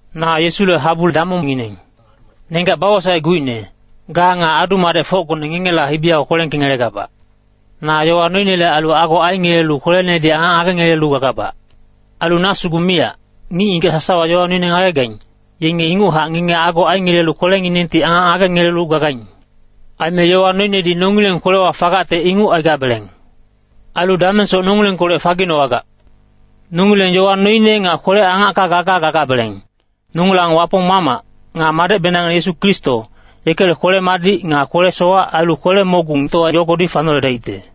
Na Yesule habu damongngineng. Nenggac bawosaecguicne, ga nga adu-madecfocgone ngengela hibi yago kwelengkengelegabac. Na yowa noinele ailu ago aingelelu kwelenedi angac ngagengelelu gagabac. Ailu na sugu miyac, ngic-ngigac sasawa yowa noine ngagegaing, yenge inguchac ngenge ago aingelelu kwelenginengti angac ngagengelelu gagaing. Aime yowa noinedi nongileng kwelewa fagacte inguc aigabeleng. Ailu damengsoc nongilengkolec faginowagac. Nongileng yowa noine nga kwele-angacka gaga gagabeleng, nongilang Wapong Mamac, nga Madecbenangngine Yesu Kristo, yekele kwele-madic nga kwele-sowac ailu kwele-mogungtowa yogodi fanoledaicte.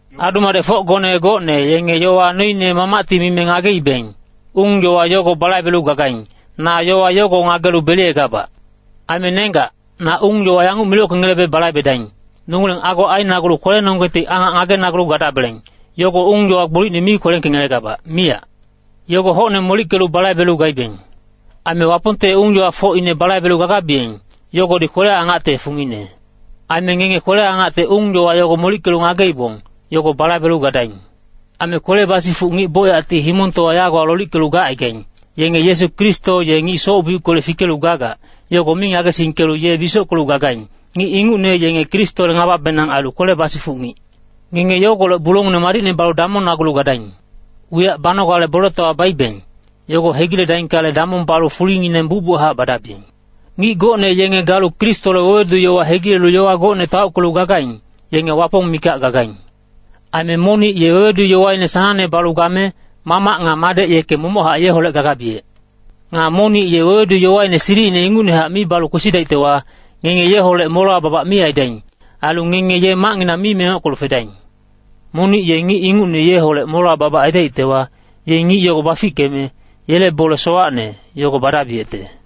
Adu-madecfocgone gocne yenge yowa noine Mamacti mime ngageibeng, ung-yowa yogo balaibelu gagaing, na yowa yogo ngagelu beliyegabac. Aime nenggac, na ung-yowa yanguc milockengelebe balaibedaing, Nongileng ago ainagulu kwelenonggengti angac ngagenagulu gadabeleng, yogo ung-yowa gbolicne mi kwelengkengelegabac, miyac. Yogo hocne molickelu balaibelu gaibeng. Aime Wapongte ung-yowafocine balaibelu gagabiyeng, yogodi kwele-angacte fungine. Aime ngenge kwele-angacte ung-yowa yogo molickelu ngageibong, yogo balaibelu gadaing. Aime kwele basifuc ngic bocyacti himongtowa yagowa lolickelu gacaigaing. Yenge Yesu Kristo ye ngic soc-biuckolec fikelu gagac, yogo mi ngagesingkelu ye bisockelu gagaing. Ngic ingucne yenge Kristole ngababenang ailu kwele basifuc ngic. Ngenge yogolec bulongineng madicne balu damongnagulu gadaing. Wiyac banogale boletowa baibeng, yogo hegiledaingkale, damong balu fulingineng bucbuchac badabiyeng. Ngic gocne yenge galu Kristole wewedu-yowa hegilelu yowa gocne taockelu gagaing, yenge Wapong mikac gagaing. Aime monic ye wewedu-yowaine sanangne balu game, Mamac nga Madec yeke momochac yeholec gagabiyec. Nga monic ye wewedu-yowaine silicine ingucnehac mi balu kwesidaictewa, ngenge yeholec molewa babac mi aidaing. Ailu ngenge ye macnginang mi mengockelu fedaing. Monic ye ngic ingucne yeholec molewa babac aidaictewa, ye ngic yogo bafickeme, yele bole sowacne, yogo badabiyecte.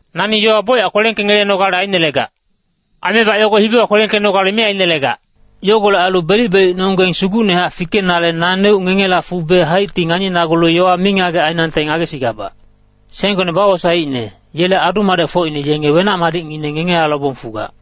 Nani yowa bocyac kwelengkengelenogale ainelegac. Aimebac yogo hibiwa kwelengkenogale mi ainelegac. Yogolec ailu belic-belicnonggeng sugucnehac fikenale naneuc ngengela fube haicti nganinagulu yowa mingagec ainangte ngagesigabac. Senggone bawosaeicne, yele adu-madecfocine yenge wenac-madicngineng ngengela lobong fugac.